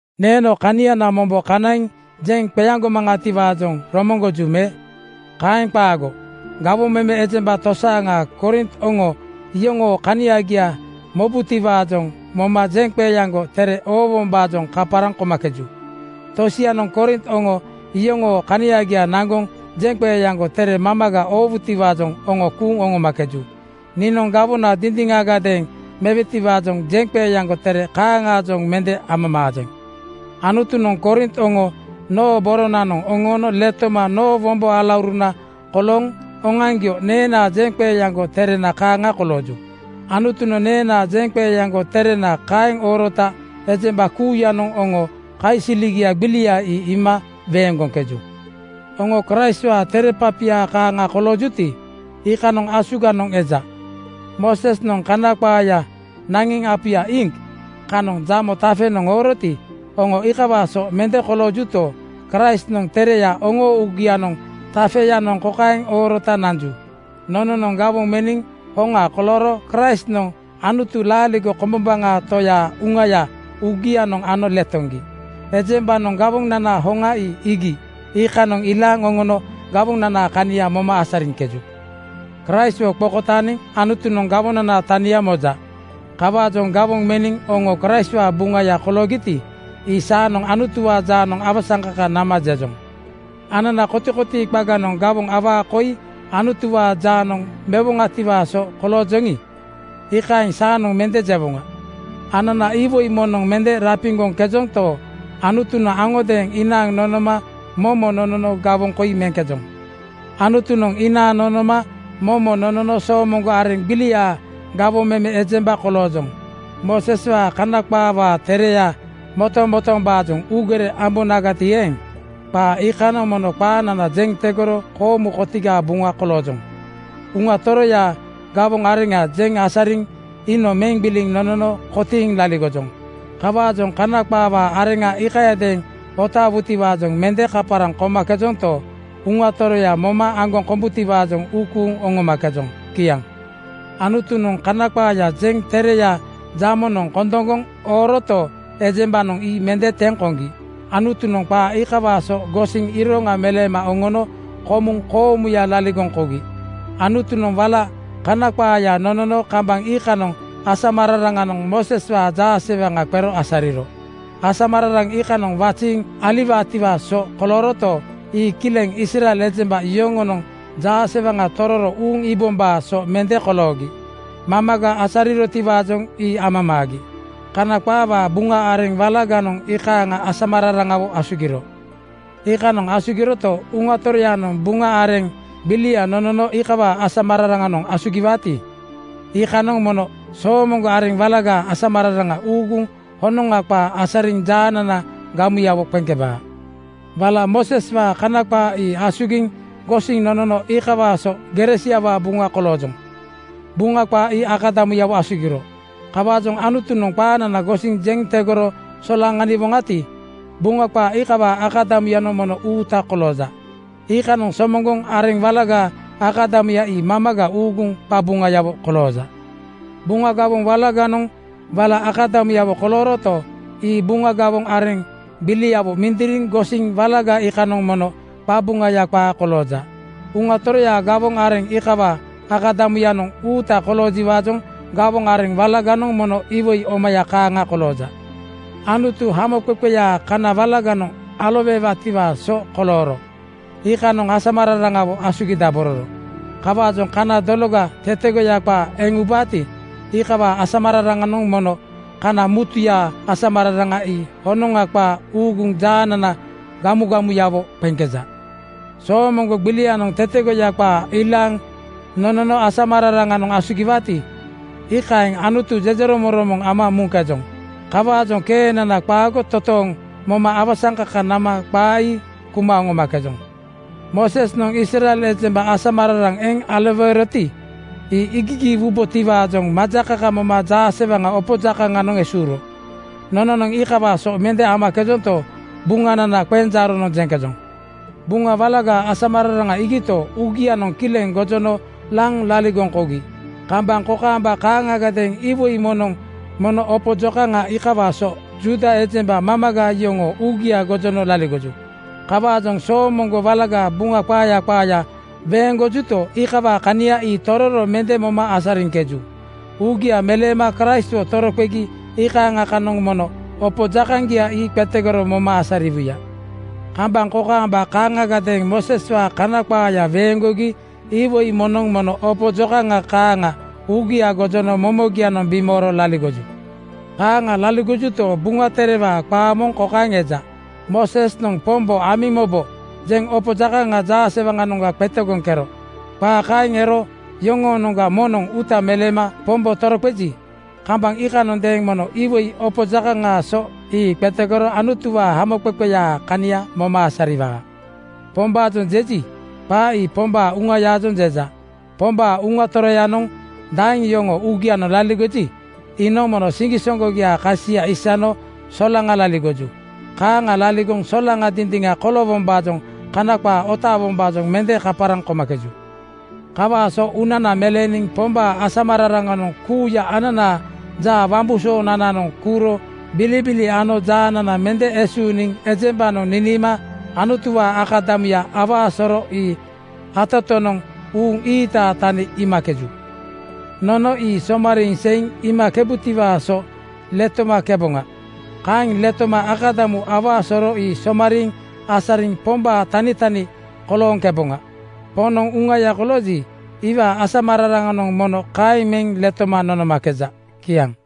Neeno kaniana mombo kanaiŋ jeŋ qeaŋgomaŋatiwaajoŋ romoŋgoju me? Kaeŋ qaago. Gawoŋ meme ejemba tosianoŋ Korint oŋo iyoŋoo kaniagia mobutiwaajoŋ moma jeŋqeeaŋgo tere oowombaajoŋ kaparaŋ komakeju. Tosianoŋ Korint oŋo iyoŋoo kanagia naŋgoŋ jeŋqeeaŋgo tere mamaga oowutiwaajoŋ oŋo kuuŋ oŋomakeju. Niinoŋ gawona dindiŋagadeeŋ mewetiwaajoŋ jeŋqeeaŋgo tere kaaŋaajoŋ mende amamaajeŋ. Anutunoŋ Korint oŋo noo boronanoŋ oŋoono letoma noo wombo alauruna kolooŋ oŋoaŋgio neenaa jeŋqeeaŋgo terena kaaŋa kolooju. Anutunoŋ neenaa jeŋqeeaŋgo terena kaeŋ oorota ejemba kuuyanoŋ oŋoo kaisiligia gbilia ii iima weeŋgoŋkeju. Oŋo Kraistwaa tere papia kaaŋa koloojuti, iikanoŋ asuganoŋ eja. Moosesnoŋ Kana qaaya naŋiŋ apuya iŋk kanoŋ jamo tafenoŋ ooroti, oŋo iikawaa so mende koloojuto, Kraistnoŋ tereya oŋoo uugiaa tafeyanoŋ kokaeŋ oorota nanju: Nononoŋ gawoŋ meniŋ hoŋa kolooro Kraistnoŋ Anutu laaligo kombombaŋa Toyaa Uŋaya uugianoŋ ano letoŋgi. Ejembanoŋ gawonanaa hoŋa ii iigi iikanoŋ ilaaŋ oŋono gawonanaa kania moma asariŋkeju. Kraistwo qokotaaniŋ Anutunoŋ gawonanaa tania moja. Kawaajoŋ gawoŋ meniŋ oŋo Kraistwaa buŋaya koloogiti, ii saanoŋ Anutuwaa jaanoŋ awasaŋkaka nama jejoŋ. Anana kotikotii qaganoŋ gawoŋ awaa koi Anutuwaa jaanoŋ mewoŋatiwaa so koloojoŋi, iikaeŋ saanoŋ mende jewoŋa. Anana iwoi moŋnoŋ mende rapiŋgoŋkejonto, Anutunoŋ aŋodeeŋ inaaŋ nonoma momo nonono gawoŋ koi meŋkejoŋ. Anutunoŋ inaaŋ nonoma momo nonono soomoŋgo areŋ gbiliaa gawoŋ meme ejemba koloojoŋ. Mooseswaa Kana qaawaa tereya motomotoombaajoŋ uugere ambonagati eeŋ, qaa iikanoŋ mono qaanana jeŋ tegoro koomu kotigaa buŋa koloojoŋ. Uŋa Toroyaa gawoŋ areŋa jeŋ asariniŋ iinoŋ meŋ gbiliŋ nonono kotiiŋ laligojoŋ. Kawaajoŋ Kana qaawaa areŋa iikayadeeŋ otaawutiwaajoŋ mende kaparaŋ komakejonto, Uŋa Toroya moma aŋgoŋ kombutiwaajoŋ uu kuuŋ oŋomakejoŋ. Kiaŋ. Anutunoŋ Kana qaaya jeŋ tereya jamonoŋ kondoŋgoŋ ooroto, ejembanoŋ ii mende teŋ koŋgi Anutunoŋ qaa iikawaa so gosiŋ iroŋa meleema oŋono komuŋ koomuya laligoŋ kougi. Anutunoŋ wala Kana qaaya nonono kambaŋ iikanoŋ asamararaŋanoŋ Mooseswaa jaasewaŋa qero asariro. Asamararaŋ iikanoŋ waziiŋ aliwaatiwaa so kolooroto, ii kileŋ Israel ejemba yoŋonoŋ jaasewaŋa tororo uuŋ iibombaa so mende koloogi. Mamaga asarirotiwaajoŋ ii amamaagi. Kana qaawaa Buŋa areŋ walaganoŋ iikaaŋa asamararaŋawo asugiro. Iikaaŋa asugiroto, Uŋa Toroyanoŋ Buŋa areŋ gbilia nonono iikawaa asamararaŋanoŋ asugiwaati, iikanoŋ mono soomoŋgo areŋ walagaa asamararaŋa uuguŋ honoŋa qaa asariŋ jaanana gamugamuyawo qeŋkebaa. Wala Mooseswaa Kana qaa ii asugiŋ gosiŋ nonono iikawaa so gere siawaa buŋa koloojoŋ. Buŋa qaa ii akadamuyawo asugiro. Kawaajoŋ Anutunoŋ qaanana gosiŋ jeŋ tegoro solaŋaniwoŋati, Buŋa qaa iikawaa akadamuyanoŋ mono uuta kolooja. Iikanoŋ soomoŋgo areŋ walagaa akadamuya ii mamaga uuguŋ qaqabuŋayawo kolooja. Buŋa gawoŋ walaganoŋ wala akadamuyawo kolooroto, ii Buŋa gawoŋ areŋ gbiliawo mindiriŋ gosiniŋ walaga iikanoŋ mono qabuŋaya qaa kolooja. Uŋa Toroyaa gawoŋ areŋ iikawaa akadamu-yanoŋ uuta koloojiwaajoŋ gawoŋ areŋ walaganoŋ mono iwoi omaya kaaŋa kolooja. Anutu hamoqeqeyaa kana walaganoŋ aloweewaatiwaa so kolooro. Iikanoŋ asamararaŋawo asugidabororo. Kawaajoŋ kana dologa tetegoya qaa eŋ ubaati, iikawaa asamararaŋanoŋ mono kana mutuyaa asamararaŋa ii honoŋa qaa uuguŋ jaanana gamugamuyawo qeŋkeja. Soomoŋgo gbilianoŋ tetegoya qaa ilaaŋ nonono asamararaŋanoŋ asugiwaati, iikaeŋ Anutu jejeromoŋromoŋ ama muŋkejoŋ. Kawaajoŋ keenana qaago totooŋ moma awasaŋkaka nama qaa ii kuma oŋomakejoŋ. Moosesnoŋ Israel ejemba asamararaŋ eŋ aloweeroti, ii iigigiiwubotiwaajoŋ majakaka moma jaasewaŋa opo jakaŋanoŋ esuuro. Nononoŋ iikawaa so mende amakejonto, Buŋanana qenjaaronoŋ jeŋkejoŋ. Buŋa walagaa asamararaŋa iigito, uugianoŋ kileŋ gojono laŋ laligoŋ kougi. Kambaŋ kokaamba kaaŋagadeeŋ iwoi moŋnoŋ mono opo jokaŋa iikawaa so Juuda ejemba mamaga yoŋoo uugia gojono laligoju. Kawaajoŋ Soomoŋgo Walagaa Buŋa qaaya qaaya weeŋgojuti, iikawaa kanagia ii tororo mende moma asariŋkeju. Uugia meleema Kraistwo toroqegi iikaaŋa kanoŋ mono opo jakaŋgia ii qetegoro moma asariwuya. Kambaŋ kokaamba kaaŋagadeeŋ Mooseswaa Kana qaaya weeŋgogi iwoi moŋnoŋ mono opo jokaŋa kaaŋa uugia gojono momogianoŋ bimooro laligoju. Kaaŋa laligojuto, Buŋa Terewaa qaa moŋ kokaeŋ eja, “Moosesnoŋ ‘Pombo amiŋ mobo,’ jeŋ opo jakaŋa jaasewaŋanoŋga qetegoŋkero.” Qaa kaeŋ ero yoŋoonoŋga moŋnoŋ uuta meleema Pombo toroqeji, kambaŋ iikanondeeŋ mono iwoi opo jakaŋaa so ii qetegoro Anutuwaa hamoqeqeyaa kania moma asariwaa. “Pombaajoŋ” jeji, qaa ii Pombaa Uŋayaajoŋ jeja. Pombaa Uŋa Toroyanoŋ daeŋ yoŋoo uugianoŋ laligoji, iinoŋ mono siŋgisoŋgogiaa kasia isano solaŋa (frii) laligoju. (Kaaŋa laligoŋ solaŋa dindiŋa koloowombaajoŋ Kana qaa otaawombaajoŋ mende kaparaŋ komakeju.) Kawaa so uunana meleeniŋ Pombaa asamararaŋanoŋ kuuya ananaa jaa wambusoonananoŋ kuuro bilibili ano jaanana mende esuuniŋ ejembanoŋ niniima Anutuwaa akadamuya awaa soro ii atatonoŋ uuŋ ii-iitaa tani iimakeju. Nono ii somariiŋ seiŋ iimakebutiwaa so letomakeboŋa. Kaeŋ letoma akadamuya awaa soro ii somariiŋ asariŋ Pombaa tanitani kolooŋkeboŋa. Poŋnoŋ Uŋaya kolooji, iwaa asamararaŋanoŋ mono kaeŋ meŋ letoma nonomakeja. Kiaŋ.